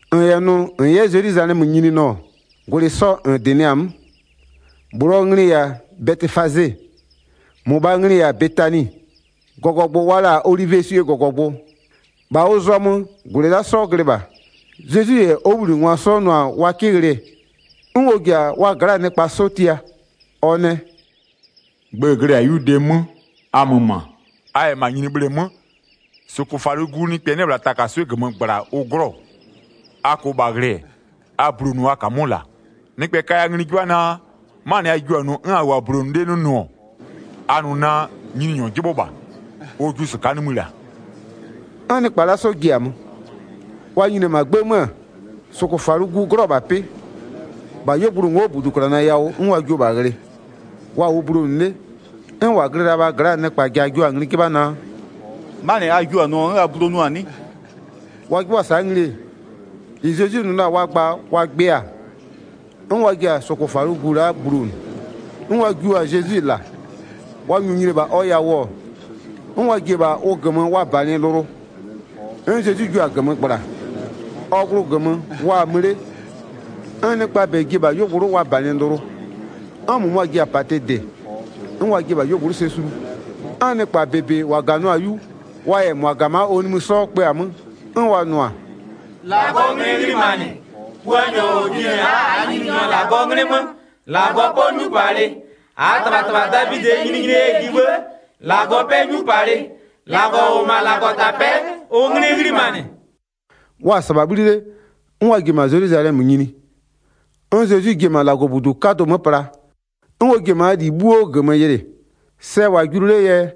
1-N -yɛ nʋ -n 'yɛ Zelwizalɛmö nyini nʋ-ɔ, -gwlɩ sɔ -n -dɩnɩ-a 'mö. -Bhlʋɔ nglɩ-ɩ -yɛ-a Bɛtɩfaze, -mʋmʋɔ nglɩ-ɩ -yɛ-a Betani. -Gɔgɔgbʋ wa la-a olivieswie -gɔgɔgbʋ, -bha ʋ zɔmö -gwlɩ la'a 'sɔ glɩ -bha. Zezwi -yɛ ɔ 'wʋbhlinɩngwa 'sɔ nʋ-a wa 'kɩ ghlɩ, 'n ɔ ji-a wa gla'aa nɩkpa 'sɔ tia, ɔ nɛ: “Gbë-ë glɩ-ɛ -la 'yu dee 'mö, a mö -ma. A -yɛ -ma nyini bhleemö, -sʋkʋfalʋgu nɩkpɛ 'nɩ-ɛ -bhla takaswɩ'ɩ -gömö -gbla ʋ 'glɔ-ɔ. A -kʋʋ -bha ghlɩ-ɛ, a bulonʋʋ a -kamʋ'ʋ -la. Nɩkpɛ kaya ngli 'jɩbha naa, 'manɩ a jiʋ-a nʋ 'n a -wʋʋ-a bulonʋ 'le 'nɩ nʋ-ɔ, a nʋ naa: Nyininyɔ 'jɩbhʋ -bha, ɔ jiʋ -sɩka'a nimï -la.” 'N nɩkpa la'a 'sɔ ji-a mö, wa nyini-e -ma 'gbë 'mö-ö, -sʋkʋfalʋgu 'glɔ-ɔ -bha 'pɩ, -bha 'yuogblʋ ngo'o -buduklana yawʋ 'n wa jiʋ-o -bha ghlɩ. Wa -wʋʋ bulonʋ 'le 'n -wa glɩ la-a -bhaa gla'aa nɩkpa ja jua-a ngli 'jɩbha naa: “'Manɩ a jiʋ-a nʋɔ 'n a bulonʋ-a 'nɩ?” Wa 'jɩbhʋa-a sa'a ngli-e, -ɩ Zezwi nʋ la-a wa gba wa gbɩ-a, 'n wa jua-a cɛ yawʋ -sa, 'n wa ji-a -sʋkʋfalʋgu la'a bulonʋ. 'N wa jiʋ-a Zezwi -la. Wa -nyʋʋ nyini-e -bha ɔ yawʋ-ɔ, 'n wa ji-e -bha ʋ -gömö wa -banɩ lʋlʋ, 'n Zezwi jiʋ-a -gömö -gbla. Ɔ glʋ -gömö wa-a mö 'le, 'n nɩkpaa -bɛ ji-e -bha 'yuogblʋ'ʋ wa -banɩ lʋlʋ, 'n -mʋmʋa ji-a -patɩ -dɩ, 'n wa jiɩ-e -bha 'yuogblʋ'ʋ sɛ sulu. 'N nɩkpa -bebe -wa -ganɩɔ-a 'yu, wa -yɛ -mʋa -ga-a -ma ɔ nimï 'sɔ kpö-a 'mö, 'n wa nʋ-a: “-Lagɔɔ 'nglɩ 'ghlimanɩ, Puanyɔ -ɔ jinɩ-ɛ la'a -aa Nyininyɔ -Lagɔɔ 'nglɩ 'mö, -Lagɔ 'pɔ 'nyupalɩ. 10-Aa -tɩbhatɩbha Davidɩɛ nyininyinie yɛ ji 'bhë, -Lagɔ 'pɛ 'nyupalɩ. -Lagɔ -ʋ -wʋ-ɔ -ma -Lagɔtapɛ'ɛ, ʋ 'nglɩ 'ghlimanɩ.” Wa-a -sɩbha 'bhli 'le, 'n wa ji-e -ma Zelwizalɛmö nyini. 'N Zezwi ji-e -ma -Lagɔbudu 'kadʋ 'mö pla, 'n ɔ ji-e -maa -li 'bhuo -gömö yɩlɩ. Sɛ-ɛ -wʋ-a julu 'lee yɛ,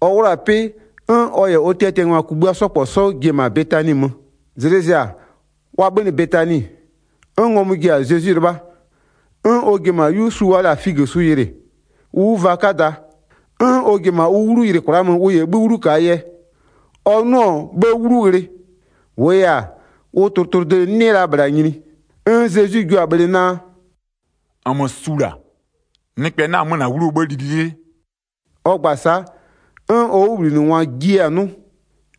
ɔ 'wlʋ-a 'pɩ 'n ɔ -yɛ ɔ tiatiangwa kugbïa 'sɔ -kpɔ 'sɔ ji-e -ma Betani mö. Zlɩ zɩ-a, wa 'bhönɩ Betani, 'n ngɔmʋ ji-a Zezwi 'lɩbha. 'N ɔ ji-e -ma 'yu su wa la-a figösu yɩlɩ, ʋ 'wuvaa 'kada. 'N ɔ ji-e -ma ʋ 'wlu yɩlɩ kwla'a mö ʋ -yɛ 'bhï 'wlu -kaa yɛ. Ɔ 'nʋ-ʋ 'bhë 'wlu ghlɩ, kpɩɛ 'nyize ʋ ka la-a 'wlu, -wʋʋ yɛ-a, ʋ tlʋtlʋde 'nɩ la -bhla nyini. 'N Zezwi jiʋ-a bhlɩ naa: “-Nmö su -la, nɩkpɛ 'na-a 'mö -na 'wluo 'bhë li 'lɩlɩlɩ.” Ɔ gba-a sa'a, 'n ɔ 'wʋbhlinɩngwa jiɩ-a 'nʋ.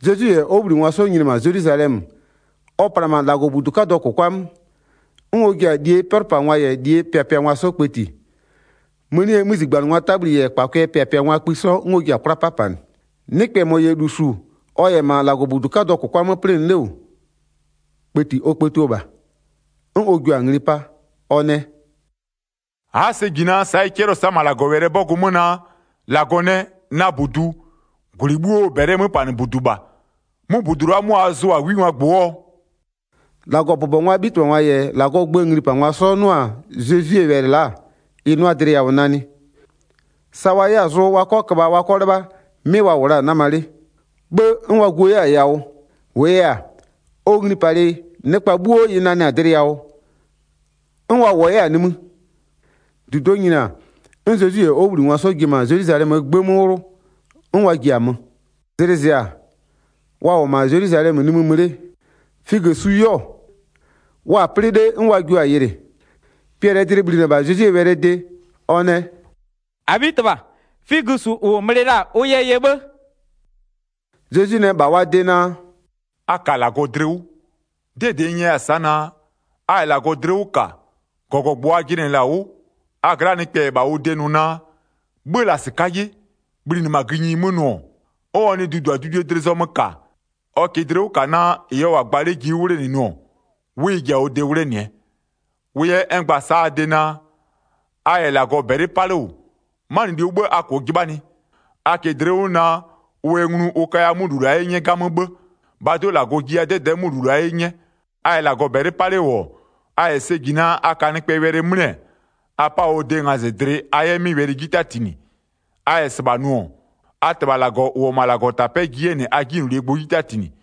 Zezwi -yɛ ɔ 'wʋbhlinɩngwa 'sɔ nyini-e -ma Zelwizalɛmö, ɔ pla-a -ma -Lagɔbudu 'kadʋɔ -kʋkwa 'mö, 'n ɔ ji-a -lie 'pɛlʋpangwa -yɛ -lie pɩapɩangwa 'sɔ kpëti. Mënie 'mözigbanɩngwaa 'tabhli -yɛ -kpakʋɩɛ 'pɛlʋpangwaa kpï 'sɔ, 'n ɔ jiɩ-a 'kwla 'papanɩ. Nɩkpɛ -mɔ -yɛ -lu -su 'bhë -ɔ -yɛ -ma -Lagɔbudu 'kadʋɔ -kʋkwa 'mö 'plɩnɩ 'le -wʋ, kpëti ɔ kpëtio -bha. 'N ɔ jua-a ngli 'pa. Ɔ nɛ: “A'a sɛ -ji naa, sa'a ɩ 'cɛlɩɔ-ɔ -ma -Lagɔwɛlɩɛ 'bɔgʋ 'mö naa: -Lagɔ nɛ: Na -budu, -gwlɩ 'bhuoo -bɛlɩɛ 'möpanɩbudu -bha. 'Mʋ -budu la'a 'mʋ a zʋa-a 'wingwaa -gbʋ 'wʋɔ?” 18-Lagɔbʋbɔngwaa 'bhitɩbhangwa -yɛ -Lagɔɔ gböö nglipangwa 'sɔ 'nʋ-a Zezwie wɛlɩ la'a, ɩ 'nʋa dlɩ yawʋ nanɩ, sa wa 'yɛ-a zʋ wa 'kɔ köbha wa 'kɔ 'lɩbha, 'mɩ wa -wʋ la-a 'nama 'le, 'bhë 'n wa guo 'yɛ-a yawʋ. -Wʋʋ yɛ-a, ɔ nglipalɩ nɩkpa 'bhuo ɩ nanɩ-a dlɩ yawʋ, 'n wa -wʋɔ 'yɛ-a nimï. 19-Dudo'o nyini-a, 'n Zezwi -yɛ ɔ 'wʋbhlinɩngwa 'sɔ ji-e -ma Zelwizalɛmöö 'gbë 'mö 'wlʋ, 'n wa ji-a mö. Zlɩ zɩ-a, wa -wʋ-ɔ -ma Zelwizalɛmö nimï mö 'le, figösu 'yɛɔ, wa-a 'plɩ 'le 'n wa jiʋ-a yɩlɩ. Piɛlɩɛ dlɩ bhlinɩ-ɛ -bha Zezwie wɛlɩɛ de, ɔ nɛ: “-Abhitɩbha, figösu -ʋ -n bhlɩ la-a ʋ yɛ yɛ 'bhë.” Zezwi nɛ -bha wa de naa: “A -ka -Lagɔ dlɩ 'wʋ. 'Dɩɛ -dɩ n nyɛya-a sa'a naa, a -yɛ -Lagɔ dlɩ 'wʋ -ka, -gɔgɔgbʋ a jɩnɩ-ɛ -la 'wʋ, a gla'aa nɩkpɛ -yɛ -bha ʋ de nʋ naa: 'Bhö-ö -la -sɩka'a 'ye, bhlinɩ -ma gïnyi 'mö nʋ-ɔ, 'n ɔ nɩ duduadudue dlɩ zɔmö -ka, ɔ -kɩɩ dlɩ 'wʋ -ka naa, -ɩ ɔ -wʋ-a gba 'le ji 'wʋ 'wlenɩ-ɛ, 'wʋ ɩ ji-a ɔ de 'wlenɩɛ. Wʋ yɛ n gba-a sa'a a de naa, a -yɛ -Lagɔ -bɛlɩ 'pa 'le -wʋ, 'manɩluo 'bhë a -kʋʋ 'jɩbhanɩ, a -kɩɩ dlɩ 'wʋ naa, ʋ yɛ nglu ʋ kaya 'mʋ -lu la'a 'ye 'nyɛ 'gamö 'bhë. -Bhaa do'o -Lagɔ jiya 'dɛdɛ'ɛ 'mʋ -lu la'a 'ye 'nyɛ. A -yɛ -Lagɔ -bɛlɩ 'pa 'le -wʋ-ɔ, a -yɛ sɛ -ji naa, a ka nɩkpɛɛ wɛlɩ 'mlɩ-ɛ, a 'pa ɔ de ngazɩdlɩ a 'yɛ 'mɩ wɛlɩ 'ji 'tatinɩ. A -yɛ -sɩbha nʋ-ɔ, a -Tɩbha -Lagɔ -ʋ -wʋ-ɔ -ma -Lagɔtapɛ'ɛ ji 'yɛ -nɩ a 'jinylolie gbʋ 'ji 'tatinɩ. [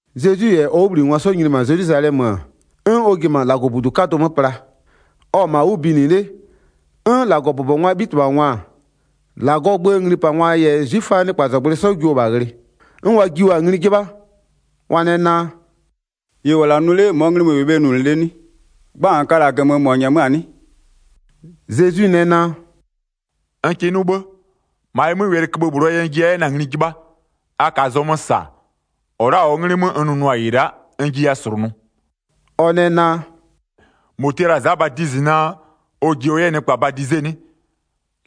Zezwi -yɛ ɔ 'wʋbhlinɩngwa 'sɔ nyini-e -ma Zelwizalɛmö-ö, 'n ɔ ji-e -ma -Lagɔbudu 'kadʋ 'mö pla. Ɔ-ɔ -ma 'wʋ binɩ 'le 'n -Lagɔbʋbɔngwaa 'bhitɩbhangwa-a, -Lagɔɔ gböö nglipangwa -yɛ 'zwiföaa nɩkpazɔgblʋɩ 'sɔ jio-o -bha ghlɩ. 'N wa jio-a ngli 'jɩbha, wa nɛ naa: “-Ɩ -n -wʋ-ɔ la'a nʋ 'le -mɔɔ nglɩ mö -n -wɩɩ bhe nʋnʋ 'le 'nɩ? Gba -n ka-a -la -gömö -mɔ -nyɛmöa-a 'nɩ?” Zezwi nɛ naa: “N kɩ 'nʋ 'bhë. -Ma ɩ 'mö, wɛlɩköbhë -bhlʋɔ yɛ n jiya 'yɛ na-a ngli 'jɩbhaa, a -kaa zɔmö -sa, -ɔ la'a -ɔɔ 'nglɩ 'mö n nʋnʋa -ɩ la'a, n jiya -slʋnʋ.” Ɔ nɛ naa: “-Mɔ tia la-a Za Badizɩ naa, ɔ ji ɔ 'yɛ nɩkpa badize 'nɩ?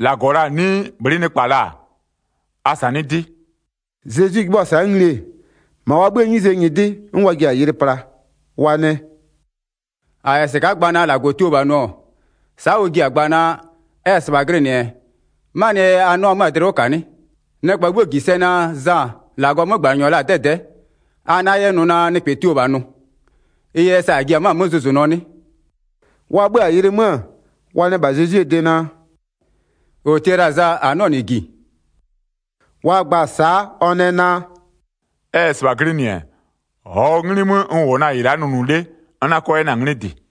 -Lagɔ la-a 'nɩɩ bhlɩ'ɩ nɩkpa la-a? A -sanɩ'ɩ 'dɩ.” Zezwi 'jɩbhʋa-a sa'a ngli-e, -ma wa 'bhïë 'nyize nyɩdɩ 'n wa ji-a yɩlɩ pla, wa nɛ: “-A -yɛ -sɩka'a gba naa -Lagɔ tio -bha nʋ-ɔ, sa'a ɔ ji-a gba naa, ɛ -yɛ -sɩbha glɩnɩ-ɛ, 'manɩɛ yɛ a 'nɩɔ la 'mö-a dlɩ 'wʋ -ka 'nɩ? Nɩkpa 'bhuo -ji 'yɛ sɛ naa, Za -Lagɔɔ 'mögbanɩnyɔ la-a 'dɛdɛ'ɛ, -a 'na 'yɛ nʋ naa nɩkpɛ tio la -bha nʋ, ɩ yɛ sa -a ji-a 'mö zʋzʋnʋɔ 'nɩ?” Wa 'bhö-a yɩlɩ 'mö-ö, wa nɛ -bha Zezwie de naa: “-Ɔ tia la-a Za -a 'nɩɔ -nɩ -ji.” Wa gba-a sa'a ɔ nɛ naa: “Ɛ -yɛ -sɩbha glɩnɩ-ɛ, -ɔɔ 'nglɩ 'mö n -wʋ-ɔ na-a -ɩ la'a nʋnʋ 'le n 'na 'kɔ 'yɛ na-a 'nglɩ -dɩ.”